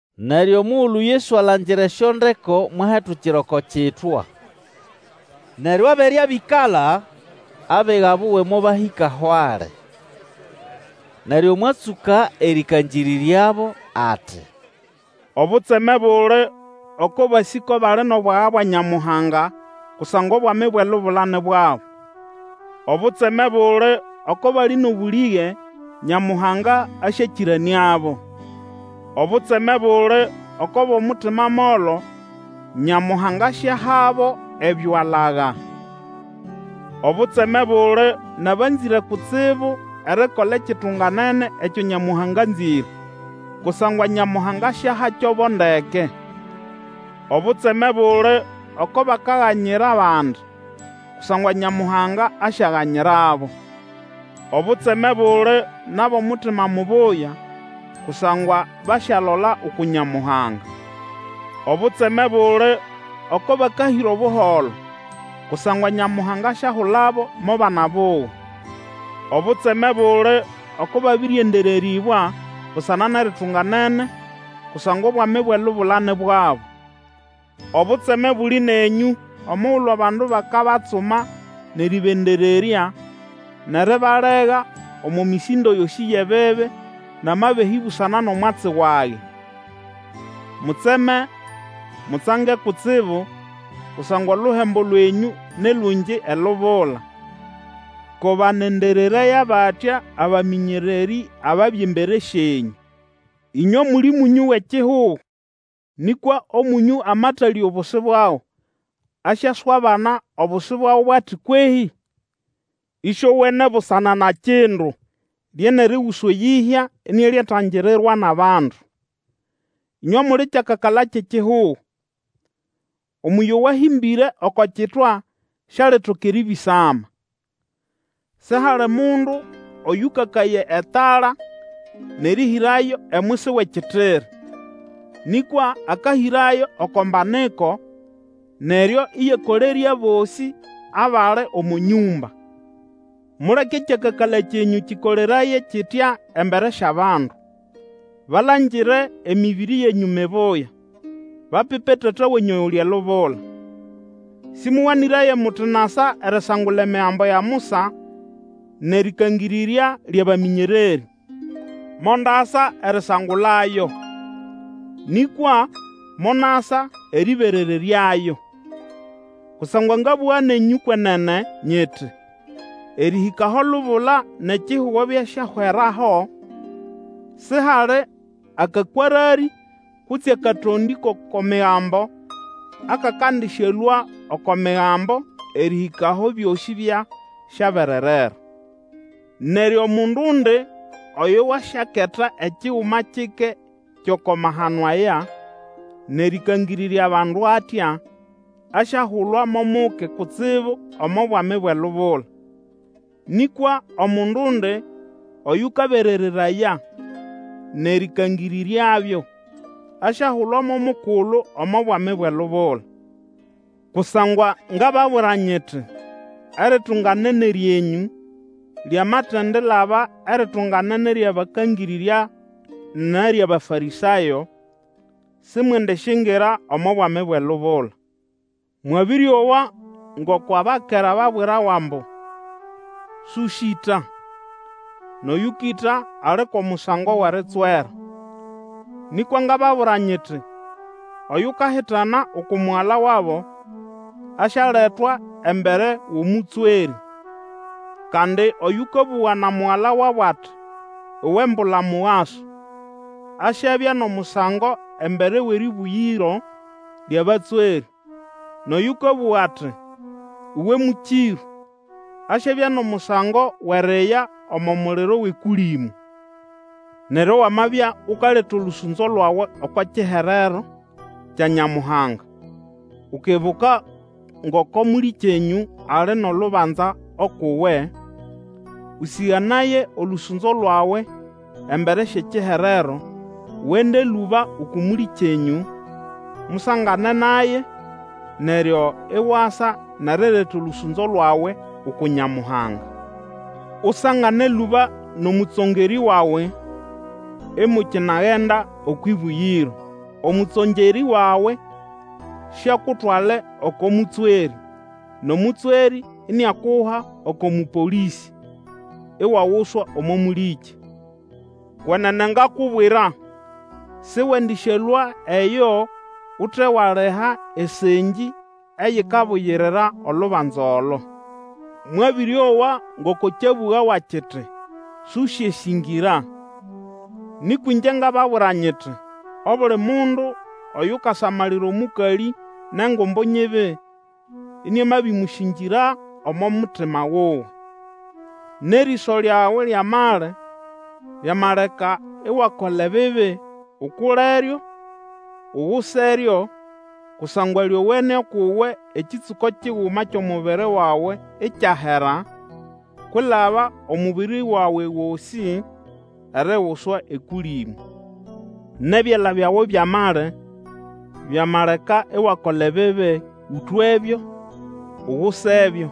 Neryo omugulu Yesu alangira esyondeko mwahetukira oko kitwa; neryo abere abĩkala, abiga buwe mobahĩka aho ali. Neryo mwatsũka erĩkangĩrĩryabo ati, Obutseme buli oko basĩ ko bali nʼobwaga bwa Nyamuhanga, Kusangwa Obwami bwʼelubula ni bwabo! Obutseme buli oko bali nʼobũlĩge, Nyamuhanga asyakĩranĩabo! Obutseme buli oko bʼomutima molo, Nyamuhanga asyahabo ebyo alaga! Obutseme buli nʼabanzĩre kutsibu erikola ekitunganene ekyo Nyamuhanga anzĩre. Kusangwa Nyamuhanga asyaha kyobo ndeke! Obutseme buli oko bakaganyira abandi, Kusangwa Nyamuhanga asyaganyirabo! Obutseme buli nʼabʼomutima mubuya, Kusangwa basyalola uku Nyamuhanga! Obutseme buli oko bakahĩra Obuholo: Kusangwa Nyamuhanga asyahulabo mo bana buwe! Obutseme buli oko babĩrĩendererĩbwa busana nʼeritunganene, Kusangwa Obwami bwʼelubula ni bwabo! Obutseme buli nenyũ omugulu abandu bakabatsuma nʼerĩbendererya, nʼeribalega omo mĩsĩndo yosĩ yʼebibi nʼamabehĩ busana nʼomwatsi wage. Mutseme, mutsange kutsibu, kusangwa oluhembo lwenyũ ni lungi elubula. Ko banendereraya batya abamĩnyererĩ ababya embere syenyũ. Ĩnywe muli mũnyũ wʼekihugo Nĩkwa omũnyũ amatalya obusi bwago, asyaswabana obusi bwago bwʼati kwehĩ? Ĩsyowene busana na kindu; lye nʼeriguswa eyĩhya inialyatangirirwa nʼabandu. Ĩnywe muli kyakakala kyʼekihugo. Omũyĩ owahĩmbĩre oko kitwa sialitoka erĩbĩsama. Sihali mundu oyũkakaya etala nʼerĩhĩrayo omwisi wʼekitiri; nĩkwa akahĩrayo oko mbaniko, neryo ĩyakolerya abosĩ abali omo nyũmba. Muleke ekyakakala kyenyũ kĩkoleraye kitya embere syʼabandu, balangire emĩbĩrĩ yenyũ mibuya, bapipe Tata wenyũ oyuli elubula. Sĩmũganĩraye muti nasa erisangula Emigambo ya Musa nʼerĩkangĩrĩrya lyʼAbamĩnyererĩ. Mondasa erisangulayo, nĩkwa monasa erĩberereryayo. Kusangwa ngabũga nenyũ kwenene, nyiti, Erĩhĩka aho lubula nʼekihugo byasyahweraho, sihali akakwararĩ kutse katondĩ kʼoko Migambo akakandĩsyalũa oko Migambo erĩhĩka aho ebyosĩ byasyabererera. Neryo Omundundi oyo wasyaketa ekiguma kike kyʼoko mahano aya, nʼerĩkangĩrĩrya abandu atya, asyahulwa mo muke kutsibu omo Bwami bwʼelubula; nĩkwa Omundundi oyũkaberereraya nʼerĩkangĩrĩryabyo, asyahulwa mo mukulu omo Bwami bwʼelubula. Kusangwa ngababwira nyiti, Eritunganene lyenyũ lyamatendilaba eritunganene lyʼabakangĩrĩrya nʼeryʼAbafarĩsayo, simwendisyingira omo Bwami bwʼelubula. Mwabĩrĩowa ngoko abakera babwirawa ambu, Sũsyĩta; nʼoyũkĩta ali kʼomusango wʼeritswera. Nĩkwa ngababwira nyiti oyukahitana uku mugala wabo asyaletwa embere wʼomũtswerĩ, kandi oyũkabũga na mugala wabo ati, uwe mbulamugaso; asyabya nʼomusango embere wʼerĩbũgĩro lyʼabatswerĩ; nʼoyũkabũga ati, Uwe mũkĩrũ! Asyabya nʼomusango wʼeriya omo muliro wʼeKũlĩmũ. Neryo wamabya ukaleta olũsũnzo lwawe oko kiherero kya Nyamuhanga, ukibuka ngoko mũlĩkyenyũ ali nʼolubanza ukʼuwe, ũsĩganaye olũsũnzo lwawe embere syʼekiherero, ugende lũba uku mũlĩkyenyũ, musangane naye, neryo iwasa nʼerireta olũsũnzo lwawe uku Nyamuhanga. Usangane lũba nʼomũtsongerĩ wawe imukinagenda okwʼĩbũgĩro; omũtsongerĩ wawe siakutwale oko mũtswerĩ, nʼomũtswerĩ iniakuha oko mũpolĩsĩ, iwaguswa omo mũlĩkĩ. Kwenene ngakubwira, sĩwendĩsyalũa eyo ute waliha esengĩ eyikabugirira olubanza olo. Mwabĩrĩowa ngoko kyabũgawa kiti, Susyesĩngĩra. Nĩkwa ĩngye ngababwira nyiti, Obuli mundu oyukasamalira omũkalĩ nʼengumbu nyibi iniamabimũsĩngĩra omo mutima wuwe. Nʼerĩso lyawe lyʼamali lyamaleka iwakola ebibi, ukuleryo, uguseryo! Kusangwa lyowene ukʼuwe ekĩtsũko kiguma kyʼomubiri wawe ikyahera kwilaba omubiri wawe gosĩ eriguswa eKũlĩmũ. Nʼebyala byawe byʼamali byamaleka iwakola ebibi, ũtwebyo, Ugusebyo!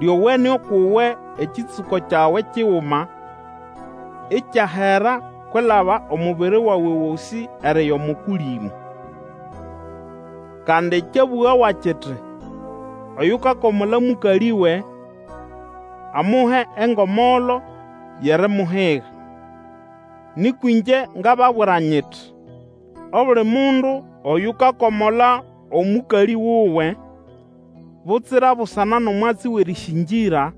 Lyowene ukʼuwe ekĩtsũko kyawe kiguma ikyahera kwilaba omubiri wawe gosĩ eriya omo Kũlĩmũ. Kandi kyabũgawa kiti, Oyukakomola mũkalĩwe, amuhe engomolo yʼerimuhiga. Nĩkwa ĩngye ngababwira nyiti, Obuli mundu oyukakomola omũkalĩ wuwe, butsira busana nʼomwatsi wʼerĩsĩngĩra,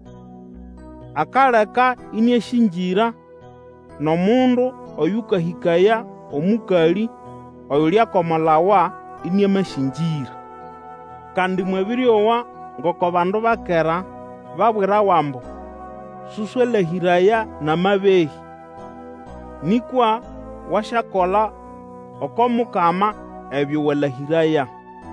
akaleka ĩnĩasĩngĩra, nʼomundu oyũkahĩkaya omũkalĩ oyuliakomolawa iniamasĩngĩra. Kandi mwabĩrĩowa ngoko abandu ba kera babwirawa ambu, Susyelahĩraya nʼamabehĩ, nĩkwa wasyakola oko Mukama ebyo walahĩraya.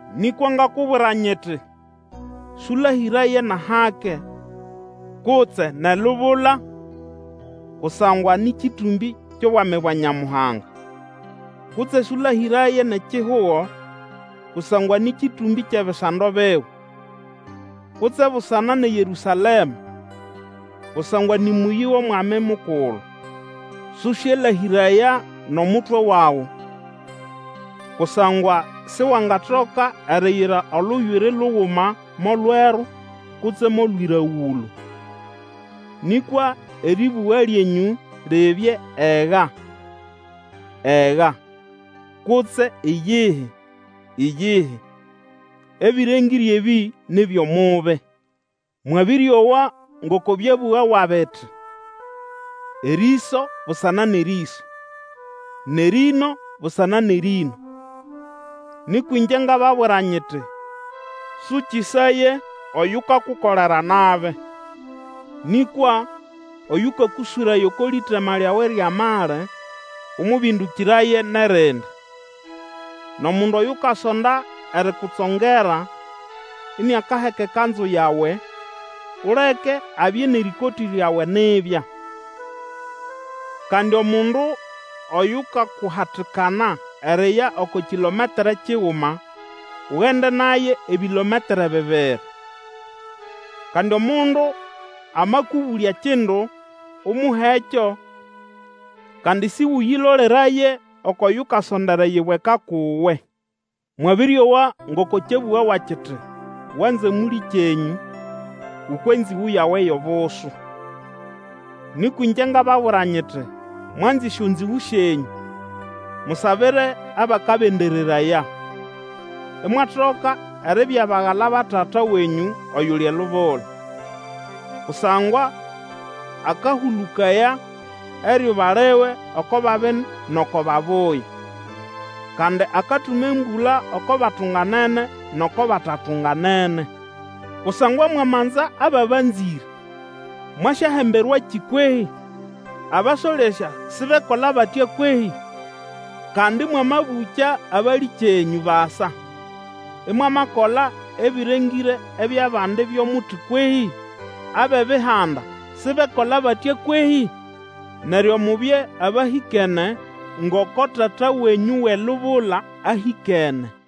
Nĩkwa ngakubwira nyiti, Sũlahĩraye nʼahake; kutse nʼelubula, kusangwa nĩ kĩtũmbĩ kyʼobwami kya Nyamuhanga. Kutse sũlahĩraye nʼekihugo, kusangwa nĩ kĩtũmbĩ kyʼebisando biwe; kutse busana nʼeYerũsalema, kusangwa nĩ mũyĩ wʼOmwami Mukulu. Sũsyelahĩraya nʼomutwe wawe, kusangwa siwangatoka eriyira oluywiri luguma mo lweru kutse mo lwĩragũlũ. Nĩkwa erĩbũga lyenyũ libye, ega, ega, kutse iyihi, iyihi! Ebĩrengĩre ebĩ ni byʼomubi. Mwabĩrĩowa ngoko byabũgawa biti, Erĩso busana nʼerĩso, nʼerĩno busana nʼerĩno. Nĩkwa ĩngye ngakubwira nyiti, Sũkĩsaye oyukakukolera nabi; nĩkwa oyũkakũswĩraya oko lĩtema lyawe lyʼamali, ũmũbindũkĩraye nʼerindi. Nʼomundu Oyukasonda erikutsongera, iniakaheka ekanzu yawe, uleke abye nʼerĩkotĩ ryawe nibya. Kandi omundu oyukakuhatikana eriya oko kilometre kiguma, ugende naye ebilometre bibiri. Kandi omundu amakũbũlya kindu, umuhekyo, kandi siguyĩloleraye oko yukasonda eriyibweka ukʼuwe. Mwabĩrĩowa ngoko kyabũgawa kiti, Wanze mũlĩkyenyũ, ũkwe enzĩgũ yawe yʼobusu. Nĩkwa ĩngye ngababwira nyiti, Mwanze esyonzĩgũ syenyũ, musabire abakabendereraya, imwatoka eribya bagala ba Tata wenyũ oyuli elubula. Kusangwa, akahũlũkaya eryuba liwe oko babi nʼoko babuya, kandi akatuma embũla oko batunganene nʼoko batatunganene. Kusangwa mwamanza abasanzĩre, mwasyahemberwakĩ kwehĩ? Abasolesya sibekola batya kwehĩ? Kandi mwamabũkya abalĩkyenyũ basa, imwamakola ebĩrengĩre ebyʼabandi byo muti kwehĩ? Abʼebihanda sibekola batya kwehĩ? Neryo mubye abahĩkene, ngoko Tata wenyũ wʼelubula ahĩkene.